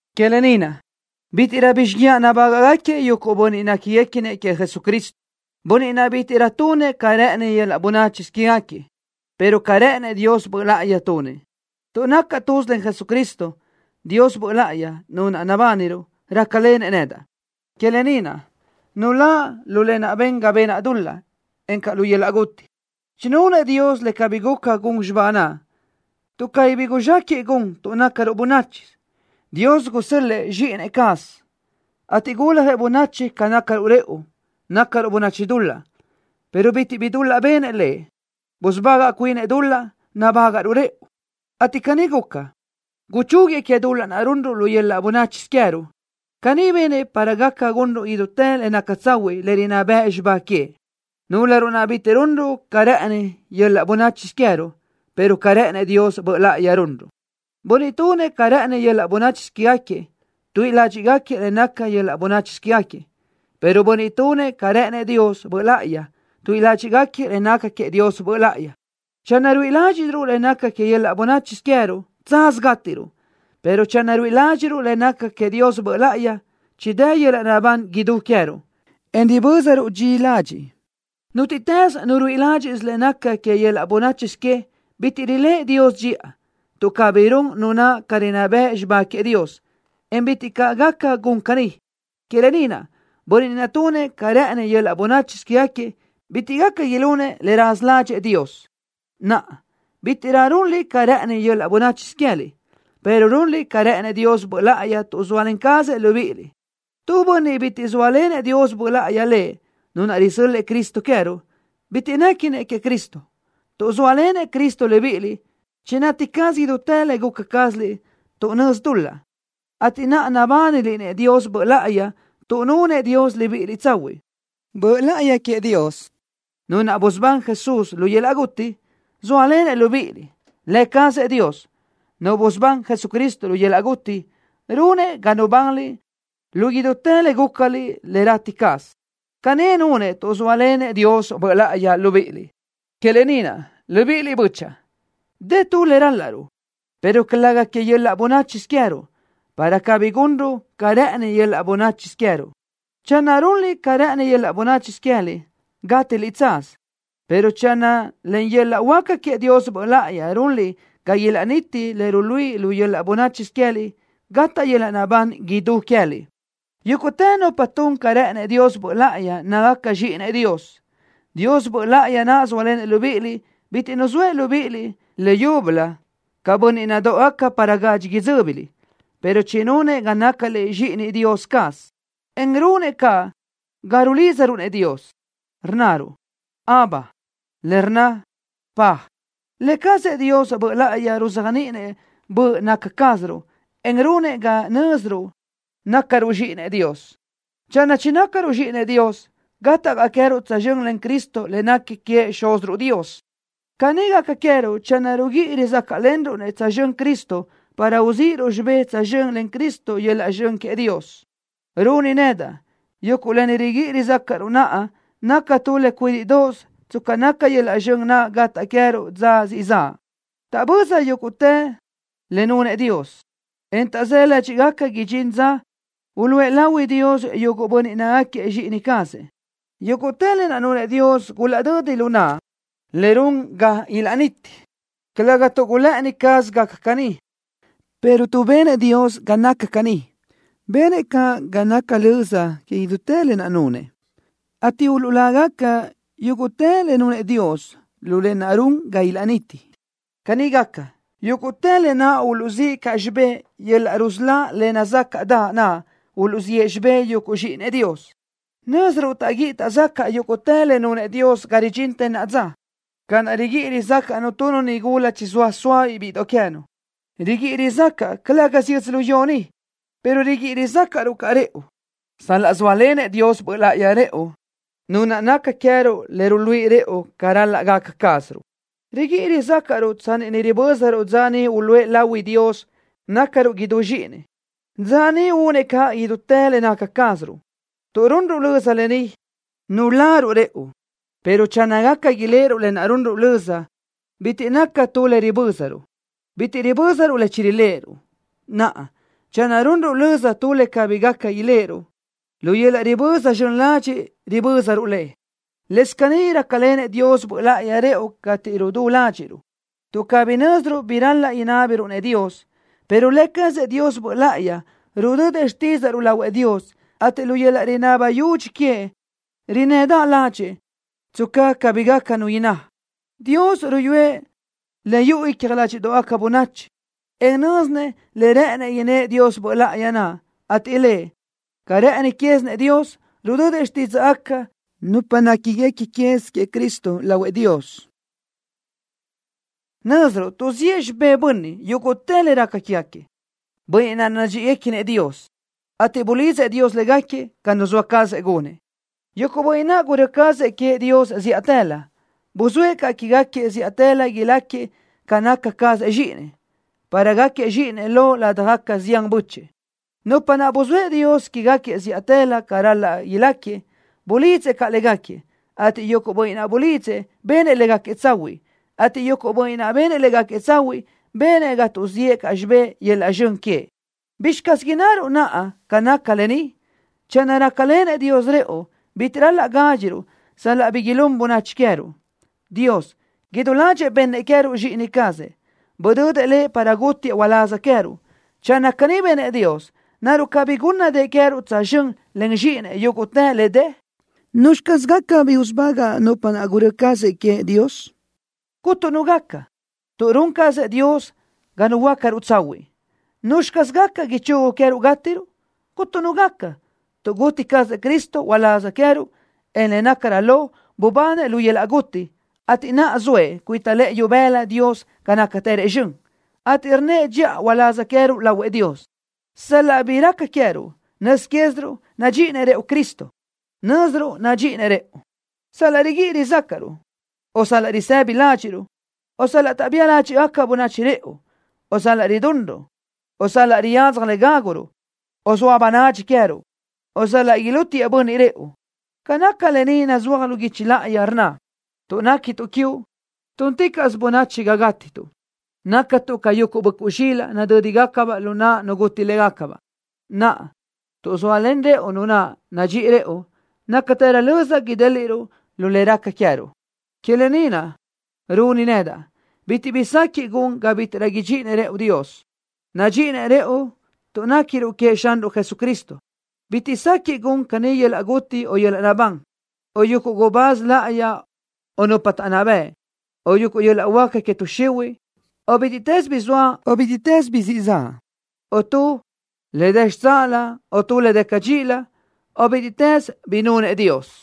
Que lë ni naʼ, bítiʼrö bi xíguiaʼ nabágaʼgaquiëʼ yuguʼ bönniʼ néquiguequinëʼ queëʼ Jesucristo, bönniʼ naʼ bítiʼrö tunëʼ ca rë́ʼëni yöl-laʼ bönáchisö quégaquiëʼ, pero ca rë́ʼënëʼ Dios Böʼ Láʼayi tunëʼ. Tuʼ nacaʼ tuz len Jesucristo, Dios Böʼ Láʼayi, Nu naʼ nabániruʼ, rácalenëʼ nedaʼ. Que lë ni naʼ, nuláʼ lu lë naʼ ben ga benaʼ dul-laʼ, encaʼ lu yöl-laʼ guti. Chinunëʼ Dios le cabí guca gun xibá naʼ, tuʼ cabí bi guzxéquiʼ gun tuʼ nácaruʼ bönáchisö. Dios gusö́l-lëʼë Zxíʼini cazëʼ, ateʼ guljëʼ bönachi ca nácaruʼ rëʼu, nácaruʼ bönachi dul-laʼ, pero bitiʼ bi dul-laʼ benëʼ Lëʼ. Busubagaʼ cuinëʼ dul-laʼ nabágaʼruʼ rëʼu, ateʼ caní guca, guchúguiëʼ que dul-laʼ runruʼ lu yöl-laʼ bönáchisö queë́ruʼ. Caní benëʼ para gaca gunruʼ idútë le naca tsahuiʼ le rinná bëʼ xibá queëʼ, núlöruʼ naʼ bítiʼrö runruʼ ca rë́ʼëni yöl-laʼ bönáchisö queë́ruʼ, pero ca rë́ʼënëʼ Dios Böʼ Láʼayi runruʼ. Bönniʼ tunëʼ ca rë́ʼëni yöl-laʼ bönáchisö quégaquiëʼ, tuíʼi ládxiʼgaquiëʼ le naca que yöl-laʼ bönáchisö quégaquiëʼ, pero bönniʼ tunëʼ ca rë́ʼënëʼ Dios Böʼ Láʼayi, tuíʼi ládxiʼgaquiëʼ le naca queëʼ Dios Böʼ Láʼayi. Channö ruíʼi ládxiʼsiruʼ le naca que yöl-laʼ bönáchisö queë́ruʼ, tsaz gátiruʼ, pero channö ruíʼi ládxiʼruʼ le naca queëʼ Dios Böʼ Láʼayi, chidë́ yöl-laʼ naʼbán idú queë́ruʼ, en ribö́zaruʼ dxi ladxiʼ. Nútiʼtës nu ruíʼi ládxiʼsö le naca que yöl-laʼ bönáchisö que, bitiʼ riléʼe Dios dxiʼa, tuʼ cabí run nu naʼ ca rinná bëʼ xibá queëʼ Dios, en bitiʼ caʼ gaca gun caní. Que lë ni naʼ, bönniʼ naʼ tunëʼ ca rë́ʼëni yöl-laʼ bönáchisö quégaquiëʼ bitiʼ gaca ilunëʼ le raza ládxëʼë Dios. Naʼa, bítiʼrö runliʼ ca rë́ʼëni yöl-laʼ bönáchisö queë́liʼ, pero runliʼ ca rë́ʼënëʼ Dios Böʼ Láʼayi tuʼ zóalen cazëʼ Lëʼ libíʼiliʼ. Tu bönniʼ bitiʼ zóalenëʼ Dios Böʼ Láʼayi lëʼ, Nu naʼ risö́l-lëʼë Cristo queë́ruʼ, bitiʼ néquinëʼ queëʼ Cristo. Tuʼ zóalenëʼ Cristo libíʼiliʼ, chinati caz idútë le guca cázaliʼ tuʼ nözi dul-laʼ, ateʼ naʼa nabániliʼ-nëʼ Dios Böʼ Láʼayi tuʼ nunëʼ Dios libíʼiliʼ tsahuiʼ. Böʼ Láʼayi queëʼ Dios, Nu naʼ busubán Jesús lu yöl-laʼ guti, zóalenëʼ libíʼiliʼ. Lë cazëʼ Dios, Nu busubán Jesucristo lu yöl-laʼ guti, runëʼ ga nubanliʼ lu idútë le gúcaliʼ le rati caz. Caní nunëʼ tuʼ zóalenëʼ Dios Böʼ Láʼayi libíʼiliʼ. Que lë ni naʼ, libíʼiliʼ bö́chaʼa, dë tu le ral-laʼruʼ, pero calëga que yöl-laʼ bönáchisö queë́ruʼ, para cabirö gunruʼ ca rë́ʼëni yöl-laʼ bönáchisö queë́ruʼ naʼ. Channö runliʼ ca rë́ʼëni yöl-laʼ bönáchisö queë́liʼ, gátiliʼ tsaz, pero channö len yöl-laʼ huáca queëʼ Dios Böʼ Láʼayi runliʼ ga ilaʼniti le runliʼ lu yöl-laʼ bönáchisö queë́liʼ, gataʼ yöl-laʼ naʼbán idú queë́liʼ. Yúguʼtë nupa tun ca rë́ʼënëʼ Dios Böʼ Láʼayi nácagaca zxíʼinëʼ Dios. Dios Böʼ Láʼayi naʼ zóalenëʼ libíʼiliʼ bitiʼ nuzóëʼ libíʼiliʼ leyúbölö ca bönniʼ nadóʼogaca para gadxi idzö́biliʼ, pero chinunëʼ ga nácaliʼ zxíʼinëʼ Dios caz, en runëʼ caʼ ga rulídzaruʼ-nëʼ Dios, rnnaruʼ: “Abba”, le rnna: Dad. Lë cazëʼ Dios Böʼ Láʼayi ruzéajniʼinëʼ böʼ naca cázaruʼ, en runëʼ ga nö́ziruʼ nácaruʼ zxíʼinëʼ Dios. Channö chinácaruʼ zxíʼinëʼ Dios, gataʼ caʼ queë́ruʼ tsözxö́n len Cristo le nequi queëʼ Xúziruʼ Dios. Caní gaca queë́ruʼ channö riguíʼi rizácaʼlenruʼ-nëʼ tsözxö́n Cristo para uzíʼiruʼ xibé tsözxö́n len Cristo yöl-laʼ zxön queëʼ Dios. Runi nedaʼ, yuguʼ lë ni riguíʼi rizácaʼruʼ naʼa naca tu le cuídiʼdoʼos tsca naca yöl-laʼ zxön naʼ gataʼ queë́ruʼ dza siʼ zaʼ. Taʼböza yúguʼtë le nunëʼ Dios, en taʼzë́ ládxiʼgaca idxintë dza naʼ uluʼë lahui Dios yuguʼ bönniʼ nácagaquiëʼ zxíʼini cazëʼ. Yúguʼtë lë naʼ nunëʼ Dios gulaʼdödi lu naʼ le run ga ilaʼniti, calëga tuʼ gulë́ʼëni caz gaca caní, pero tuʼ benëʼ Dios ga naca caní. Benëʼ caʼ ga naca löza que idútë lë naʼ nunëʼ, ateʼ uluʼlágaca yúguʼtë le nunëʼ Dios lu lë naʼ run ga ilaʼniti. Caní gaca, yúguʼtë lë naʼ uluʼzíʼ caʼ xibé yöl-laʼ rusölá le nazácaʼdaʼ naʼ uluʼziʼë xibé yuguʼ zxíʼinëʼ Dios. Nö́ziruʼ taʼguíʼi taʼzacaʼ yúguʼtë le nunëʼ Dios ga ridxintë naʼa dza, ca naʼ riguíʼi rizácaʼnu tu nigula chizóa sóabiʼ bíʼidoʼ queë́nu. Riguíʼi rizácaʼa, calë́gasö yödzölió ni, pero riguíʼi rizácaʼruʼ caʼ rëʼu, sal-laʼ zóalenëʼ Dios Böʼ Láʼayi rëʼu, Nu naʼ naca queë́ruʼ le ruluíʼi rëʼu ca ral-laʼ gaca cázaruʼ. Riguíʼi rizácaʼruʼ tsanni ni ribö́zaruʼ dza niʼ uluʼë lahui Dios nácaruʼ idú zxíʼinëʼ, dza niʼ únëʼ caʼ idútë le naca cázaruʼ. Tuʼ runruʼ löza lë ni, nuláruʼ rëʼu, pero channö gaca iléʼeruʼ lë naʼ runruʼ löza, bitiʼ naca tu le ribö́zaruʼ. Bitiʼ ribö́zaruʼ le chiriléʼeruʼ. Naʼa, channö runruʼ löza tu le cabí gaca iléʼeruʼ, lu yöl-laʼ riböza zxön ladxiʼ ribö́zaruʼ le. Lëscaʼ caní rácalenëʼ Dios Böʼ Láʼayi rëʼu cateʼ rudú ládxiʼruʼ, tuʼ cabí nö́ziruʼ bi ral-laʼ inábiruʼ-nëʼ Dios, pero Lë cazëʼ Dios Böʼ Láʼayi rudödëʼ xtídzaʼruʼ lahuëʼ Dios, ateʼ lu yöl-laʼ rinaba yudxi queëʼ rinnëdaʼ ládxëʼë, tsca cabí gaca nu inná. Dios ruyúëʼ le yuʼu icja ládxiʼdoʼgaca bönachi, en nö́zinëʼ le rë́ʼënëʼ innë́ʼ Dios Böʼ Láʼayi naʼ, ateʼ Lëʼ, ca rë́ʼëni quézinëʼ Dios, rudödëʼ xtídzaʼgaca nupa néquiguequi quez queëʼ Cristo lahuëʼ Dios. Nö́ziruʼ tuʼziʼë xibé bönniʼ yúguʼtë le raca quégaquiëʼ, bönniʼ naʼ nadxíʼiguequinëʼ Dios, ateʼ bulidzëʼ Dios légaquiëʼ ca nuzóa cazëʼ gunëʼ. Yuguʼ bönniʼ naʼ gurö́ cazëʼ queëʼ Dios zíʼatëlö, buzóëʼ caʼ quégaquiëʼ zíʼatëlö ilácagaquiëʼ ca naca cazëʼ Zxíʼinëʼ, para gáquiëʼ Zxíʼinëʼ lo ladaj zián bö́chëʼë. Nupa naʼ buzóëʼ Dios quégaquiëʼ zíʼatëlö ca ral-laʼ ilácagaquiëʼ, bulidzëʼ caʼ légaquiëʼ, ateʼ yuguʼ bönniʼ naʼ bulidzëʼ, benëʼ légaquiëʼ tsahuiʼ, ateʼ yuguʼ bönniʼ naʼ benëʼ légaquiëʼ tsahuiʼ, benëʼ ga tuʼziʼë caʼ xibé yöl-laʼ zxön queëʼ. ¿Bizxi caz innaruʼ naʼa ca nácagaca lë ni? Channö rácalenëʼ Dios rëʼu, bitiʼ ral-laʼ gádxiruʼ sal-laʼ bi ilún bönachi queë́ruʼ. Dios, idú ládxëʼë bennëʼ queë́ruʼ Zxíʼini cazëʼ. Budödëʼ lëʼ para gútiëʼ uláz queë́ruʼ. Channö caní benëʼ Dios, ¿naruʼ cabí gúnnadëʼë queë́ruʼ tsözxö́n len Zxíʼinëʼ yúguʼtë le dë? ¿Nuzxi caz gaca bi usubagaʼ nupa naʼ gurö́ cazëʼ queëʼ Dios? ¡Cuntu nu gaca, tuʼ run cazëʼ Dios ga nuhuöácaruʼ tsahuiʼ! ¿Nuzxi caz gaca ichugu queë́ruʼ gátiruʼ? ¡Cuntu nu gaca, tuʼ guti cazëʼ Cristo uláz queë́ruʼ, en le nácarö lo, bubanëʼ lu yöl-laʼ guti, ateʼ naʼa zoëʼ cuita lëʼë ibëla Dios ga nácatërëʼ zxön, ateʼ rnnëʼ dxiʼa uláz queë́ruʼ lahuëʼ Dios! Sal-laʼ bi raca queë́ruʼ, nöz quéziruʼ nadxíʼinëʼ Cristo rëʼu. Nö́ziruʼ nadxíʼinëʼ rëʼu: sal-laʼ riguíʼi rizácaʼruʼ, o sal-laʼ risëbi ládxiʼruʼ, o sal-laʼ taʼbía ládxiʼgaca bönachi rëʼu, o sal-laʼ ridunruʼ, o sal-laʼ riyadzaj le gácuruʼ, o sal-laʼ zoa bönadxi queë́ruʼ, o sal-laʼ ilútiëʼ bönniʼ rëʼu. Ca nácagaca lë ni nazúaj lu guichi láʼayi, rnna: Tuʼ néquituʼ quiuʼ Liʼ, túnticaʼsö bönachi ga gátituʼ. Nácatuʼ ca yuguʼ böʼcuʼ zxilaʼ, nadö́digacabaʼ lu naʼ nu guti légacabaʼ. Naʼa, tuʼ zóalen rëʼu Nu naʼ nadxíʼi rëʼu, nácatërö löza idéliʼruʼ lu le raca queë́ruʼ. Que lë ni naʼ runi nedaʼ: Bitiʼ bi sequiʼ gun ga bítiʼrö idxíʼinëʼ Dios rëʼu. Nadxíʼinëʼ rëʼu tuʼ néquiruʼ queëʼ Xanruʼ Jesucristo. Bitiʼ sequiʼ gun caní yöl-laʼ guti o yöl-laʼ naʼbán, o yuguʼ gubáz láʼayi o nupa taʼnná bëʼ, o yuguʼ yöl-laʼ huáca que tuʼ xihuiʼ, o bítiʼtës bi zoa o bítiʼtës bi siʼ zaʼ, o tu le dë xitsáʼalö o tu le dë cadxíʼilö, o bítiʼtës bi nunëʼ Dios.